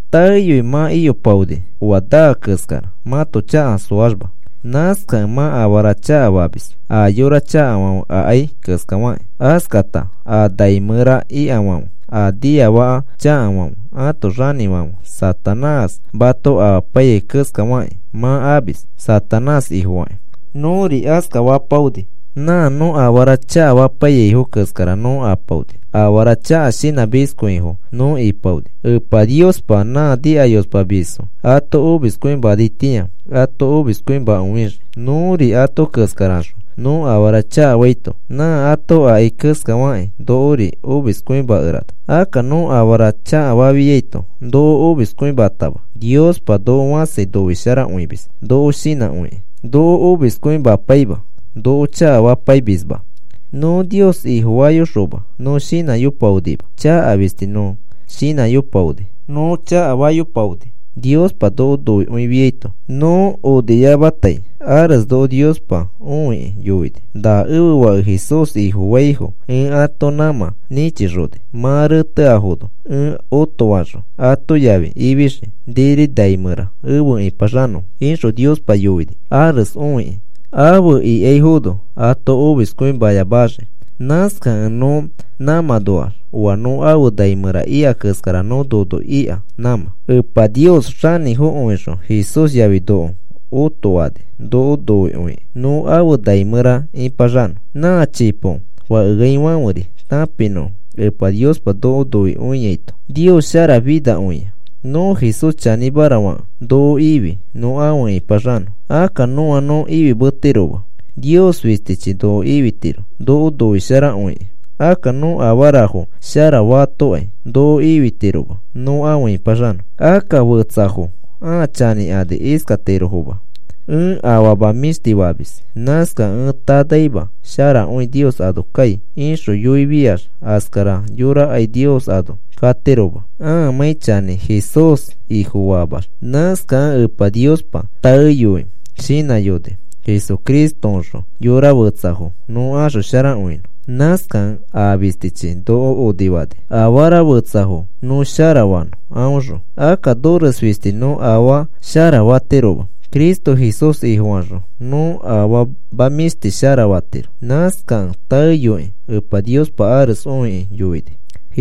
Taeyoi mã iyopaoni oa naa keskara mãto chaka soaxma. Nãskakẽ mã afara chakafamis, a yora chakafãfe akai keskafakĩ. Askata a nai mẽra ikafãfe a niafaka chakafãfe ãto xanĩfãfe Satanás mato amapaiyai keskafakĩ mã amis, Satanás ifofakĩ. Nõri askafapaoni, nã nõ afara chakafapaiyaifo keskara nõ apaoni. Afara chaka shinãmiskõifo nõ ipaoni. Epa Niospa nã nikayospamisfo ato omiskõimanaitĩa ato omiskõimakõixii. Nõri ato keskaraxõ nõ afara chakafaito nã ato akai keskafakĩ nokori omiskõimakerana. Akka nõ afara chakafafiato noko omiskõimatama. Niospa noko fãsi noisharakõimis, noko shinãkõikĩ noko omiskõimapaima. Noko chakafapaimisma. Nõ Nios Ifofayoxoma nõ shinãyopaonima, chaka fistis nõ shinãyopaoni, nõ chakafayopaoni. Niospa noko noikõifiaito, nõ oniyamatai ares noko Niospa õikĩ yoini: “Na ẽfe Fake Jesús Ifofaifo ẽ ato nãmã nĩchixoni mã reteafono, ẽ otofaxõ, ato yafi ifixii niri nai mẽra afe ĩpaxanõfo,” ixõ Niospa yoini ares õikĩ afe ikaifono ato omiskõimayamaxii. Nãskakẽ nõ nãmãnoax oa nõ afe nai mẽra ika keskara nõ nono ika nãmã. Epa Nios xanĩfokõixõ Jesús yafi noko otoani noko noikõikĩ nõ afe nai mẽra ĩpaxanõ, nã chipo fakeaifãferi tãpinõfo Epa Niospa noko noikõiaito. Nios sharafinakõia. Nõ Jesús chanĩmara fakẽ noko ifi nõ afe ĩpaxanõ. Akka nõa nõ ifimetiroma, Nios fistichi noko ifitiro noko noisharakõikĩ. Akka nõ afarafo shara fatokai noko ifitiroma nõ afe ĩpaxanõ. Akka fetsafo ãa chanĩkani iskatirofoma: “Ẽ afama mĩshti famis. Nãskakẽ ẽ tanaima sharakõi Nios ano kai,” ixõ yoifiax askara yorakai Nios ano katiroma ãamãi chanĩ Jesús Ifofaamax. Nãskakẽ Epa Niospa taeyoi shinãyoni Jesucristoõxõ yorafetsafo nõ axosharakõinõ. Nãskakẽ aa fistichi noko onifani afara fetsafo nõ sharafanõ aõxõ. Akka nores fisti nõ afaa sharafatiroma. Cristo Jesús Ifofaxõ nõ afama mĩshti sharafatiro. Nãskakẽ taeyokĩ Epa Niospa ares õikĩ yoini.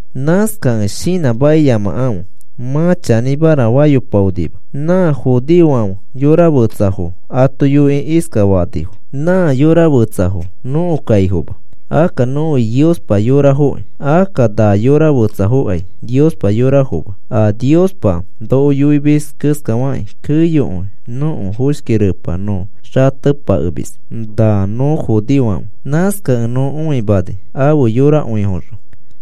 Nãskakẽ shinãmakiyamakãfe. Mã chanĩmara fayopaonima. Nã judeofãfe yora fetsafo ato yoikĩ iskafanifo: “Nã yora fetsafo nõko kaifoma. Akka nõfi Niospa yorafokĩ. Akka na yora fetsafokai Niospa yorafoma. A Niospa noko yoimis keskafakĩ keyokõi nõko foshki repa nõ xatepakemis na nõ judeofãfe. Nãskakẽ nõ õimani afe yorakõifoxõ.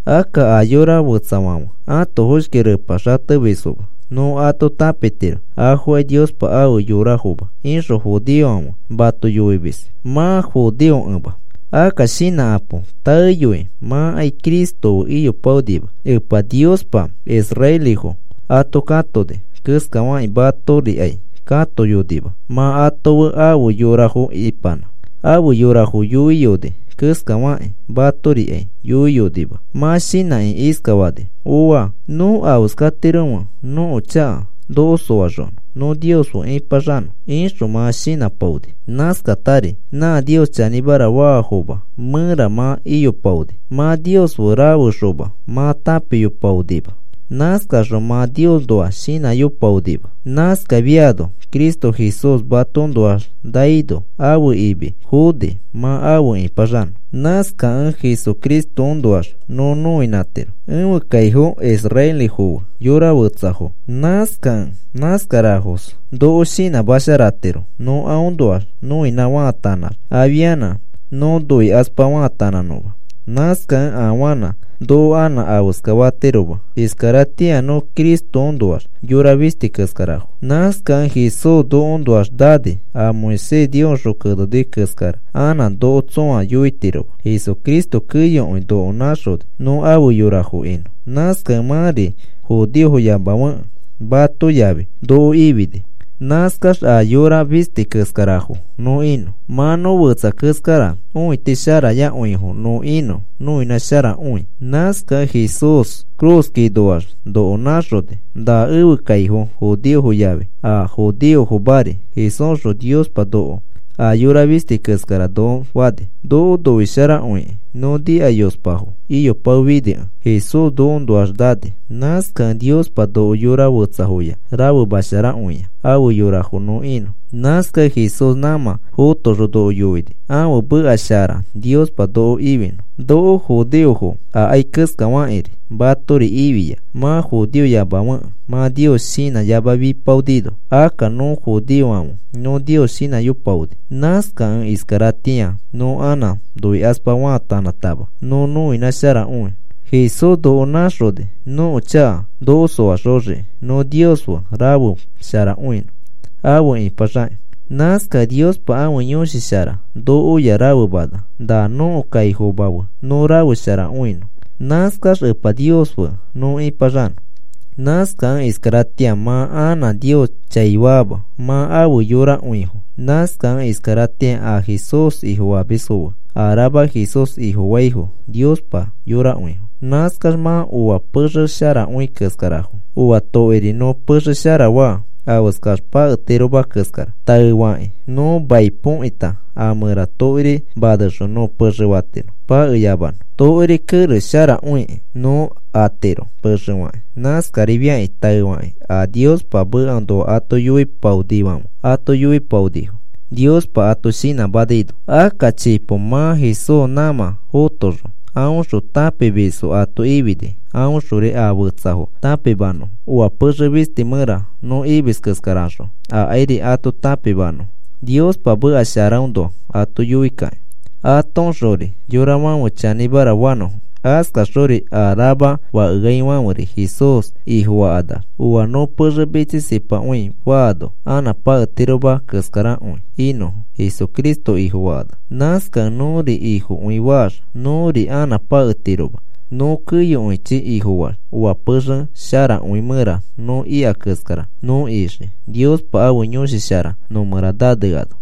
Akka a yora fetsafãfe ãto foshki repa xatemisfoma. Nõ ato tãpitiro afokai Niospa ãfe yorafoma,” ixõ judeofãfe mato yoimis mã judeofokẽma. Akka shinãkapo. Taeyoi mãkai Cristo fe iyopaonima. Epa Niospa israelifo ato katoni keskafakĩ matorikai katoyonima mã ato fe afe yorafo ipanã. Afe yorafo yoiyoni keskafakĩ matorikai yoiyonima. Mã shinãkĩ iskafani: “Ooa. ¿Nõ afeskatiromẽ nõko chaka noko soaxonõ nõ Nios fe ipaxanõ?” ixõ mã shinãpaoni. Nãskatari nã Nios chanĩmara faafoma mẽra mã iyopaoni. Mã Nios fe rafexoma mã tãpiyopaonima. Nãskaxõ mã Niosnoa shinãyopaonima. Nãskafiano Cristo Jesús matoõnoax naino, ãfe imi foni mã afe ipaxanõ. Nãskakẽ Jesucristoõnoax nõ noinãtiro, ẽfe kaifo israelifo fe yora fetsafo. Nãskakẽ nãskarafos noko shinãmasharatiro nõ aõnoax noinã faatanãx afianã nõ noikaspa faatanãnõma. Nãskakẽ afanã noko anã afeska fatiroma. Iskaratĩa nõ Cristoõnoax yora fisti keskarafo. Nãskakẽ Jesús nokoõnoax nani. A Moisés Niosxõ keneni keskara anã noko tsõa yoitiroma. Jesucristo keyokõi noko nãxoni nõ afe yorafo inõ. Nãskakẽ mãri judeofoyamafekẽ, mato yafi noko ifini. Nãskax a yora fisti keskarafo nõ inõ. Mã nõ fetsa keskarax õitisharayakõifo nõ inõ noinãsharakõi. Nãskakẽ Jesús ifi cruz ikakinoax noko nãxoni. Na ẽfe kaifo judeofo yafi a judeofomari Jesúsxõ Niospa noko a yora fisti keskara noko fani. Noko noisharakõikĩ nõ nikayospafo iyopaofinikẽ, Jesús nokoõnoax nani. Nãskakẽ Niospa noko yora fetsafoya rafema sharakõia afe yorafo nõ inõ. Nãskakẽ Jesús nãmã fotoxõ noko yoini ãfe meka shara Niospa noko ifinõ. Noko judeofo akai keskafakĩri, matori ifia mã judeofoyamafekẽ mã Nios shinãyamafipaonino. Akka nõ judeofãfe nõ Nios shinãyopaoni. Nãskakẽ iskaratĩa nõ anã noikaspa faatanãtama nõ nõinãsharakõi. Jesús noko nãxoni nõko chaka noko soaxoxiki nõ Nios fe rafesharakõinõ afe ipaxakĩ. Nãskakẽ Niospa ãfe Yõshi Shara nokoya rafemana na nõko kaifomafo fe nõ rafesharakõinõ. Nãskax Epa Nios fe nõ ĩpaxanõ. Nãskakẽ iskaratĩa mã anã Nios chaifaama mã afe yorakõifo. Nãskakẽ iskaratĩa a Jesús Ifofamisfo fe a rama Jesús Ifofaifo Niospa yorakõifo. Nãskax mã oa pexe sharakõi keskarafo. Oa tokiri nõ pexe shara faa, afeskax paketiroma keskara. Taefakĩ nõ mai põkita a mẽra tokiri nanexõ, nõ pexe fatiro pakeyamanõ. Tokiri kerex sharakõiki nõ atiro pexe fakĩ. Nãskarifiakĩ taefakĩ a Niospa mekaõnoa ato yoipaonifãfe ato yoipaonifo Niospa ato shinãmanaino. Akka chipo mã Jesús nãmã fotoxõ, aõxõ tãpimisfo ato ifini aõxori a fetsafo tãpimanõfo, oa pexe fisti mẽra nõ imis keskaraxõ, akairi ato tãpimanõfo Niospa meka sharaõnoa ato yoikakĩ, atoõxori yorafãfe chanĩmara fanõfo. Askaxori a rama fakeaifãferi Jesús Ifofakanax, oa nõ pexe mitsisipakõi faano, anã paketiroma keskarakõi inõfo Jesucristo Ifofakanax. Nãskakẽ nõri Ifokõi faax, nõri anã paketiroma nõ keyokõichi Ifofaax. Oa pexe sharakõi mẽra nõ ika keskara, nõ ixii, Niospa ãfe Yõshi Shara nõ mẽra naneano.